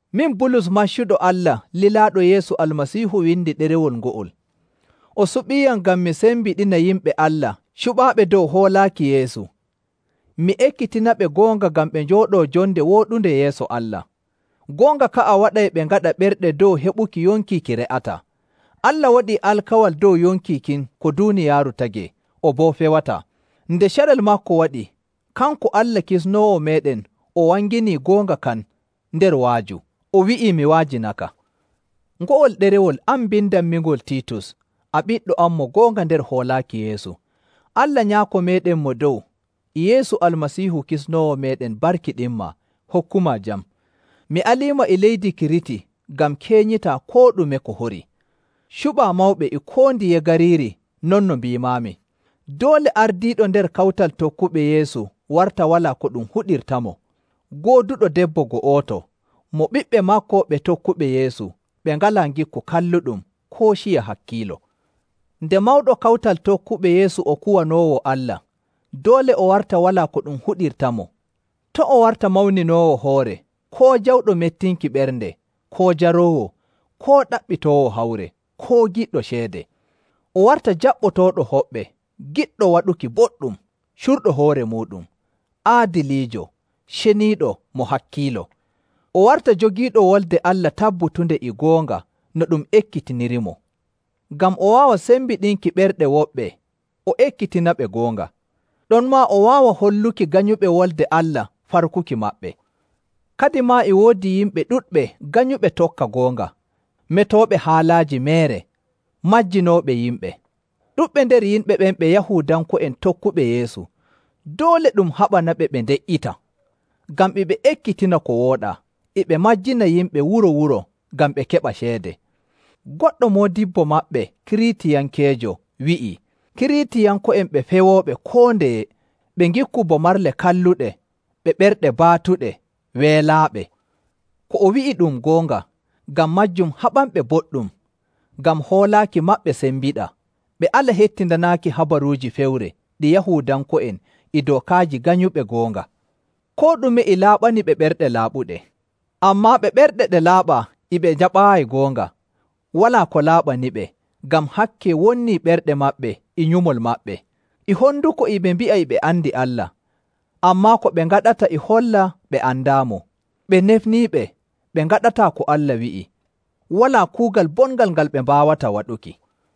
Min, Bulus maccuɗo Allah lilaaɗo Yeesu Almasiihu windi ɗerewol ngo'ol. O suɓiiyam ngam mi sembiɗina yimɓe Allah cuɓaaɓe dow hoolaaki Yeesu, mi ekkitinaɓe goonga ngam ɓe njooɗoo jonde wooɗunde yeeso Allah. Goonga ka'a waɗay ɓe ngaɗa ɓerɗe dow heɓuki yonki ki re'ataa. Allah waɗii alkawal dow yonki kin ko duuniyaaru tagee, o boo fewataa. Nde carel maako waɗi, kanko Allah Kisnoowo meeɗen o wanginii goonga kan nder wa'aju, o wi'ii mi wa'ajinaka. Ngo'ol ɗerewol, an mbindanmingol Tiitus, a ɓiɗɗo am mo goonga nder hoolaaki Yeesu. Allah Nyaako meeɗen Mo Dow, e Yeesu Almasiihu Kisnoowo meeɗen barkiɗinmaa, hokkumaa jam. Mi aliima e leydi Kiriti ngam keenyitaa koo ɗume ko horii, cuɓaa mawɓe e koo ndiye gariiri non no mbiimaami. Doole ardiiɗo nder kawtal tokkuɓe Yeesu warta walaa ko ɗum huɗirtamo, gooduɗo debbo go'oto, mo ɓiɓɓe maako ɓe tokkuɓe Yeesu ɓe ngalaa ngikku kalluɗum koo ciya hakkiilo. Nde mawɗo kawtal tokkuɓe Yeesu o kuwanoowo Allah, doole o warta walaa ko ɗum huɗirtamo. To' o warta mawninoowo hoore, koo jawɗo mettinki ɓernde, koo jaroowo, koo ɗaɓɓitoowo hawre, koo giɗɗo ceede. O warta jaɓɓotooɗo hoɓɓe, giɗɗo waɗuki boɗɗum, curɗo hoore muuɗum, aadiliijo, ceniiɗo, mo hakkiilo. O warta jogiiɗo Wolde Allah tabbutunde e goonga no ɗum ekkitinirimo, ngam o waawa sembiɗinki ɓerɗe woɓɓe o ekkitinaɓe goonga. Ɗonmaa o waawa holluki ganyuɓe Wolde Allah farkuki maɓɓe. Kadimaa e woodi yimɓe ɗuɗɓe nganyuɓe tokka goonga, metooɓe haalaaji meere, majjinooɓe yimɓe. Ɗuɗɓe nder yimɓe ɓen ɓe Yahuudanko'en tokkuɓe Yeesu. Doole ɗum haɓanaɓe ɓe nde''ita, ngam e ɓe ekkitina ko wooɗaa, e ɓe majjina yimɓe wuro‑wuro ngam ɓe keɓa ceede. Goɗɗo moodibbo maɓɓe, Kiriitiyankeejo, wi'ii, “Kiriitiyanko'en ɓe pewooɓe koo ndeye, ɓe ngikku bo marle kalluɗe, ɓe ɓerɗe baatuɗe, weelaaɓe.” Ko o wi'i ɗum goonga. Ngam maajum haɓanɓe boɗɗum, ngam hoolaaki maɓɓe sembiɗa, ɓe ala hettindanaaki habaruuji fewre ɗi Yahuudanko'en e dookaaji ganyuɓe goonga. Koo ɗume e laaɓani ɓe ɓerɗe laaɓuɗe. Ammaa ɓe ɓerɗe ɗe laaɓaa e ɓe njaɓaayi goonga, walaa ko laaɓaniɓe, ngam hakke wonnii ɓerɗe maɓɓe e nyumol maɓɓe. E honduko e ɓe mbi'a e ɓe andi Allah, ammaa ko ɓe ngaɗata e holla ɓe andaamo. Ɓe nefniiɓe, ɓe ngaɗataa ko Allah wi'i, walaa kuugal bongal ngal ɓe mbaawata waɗuki.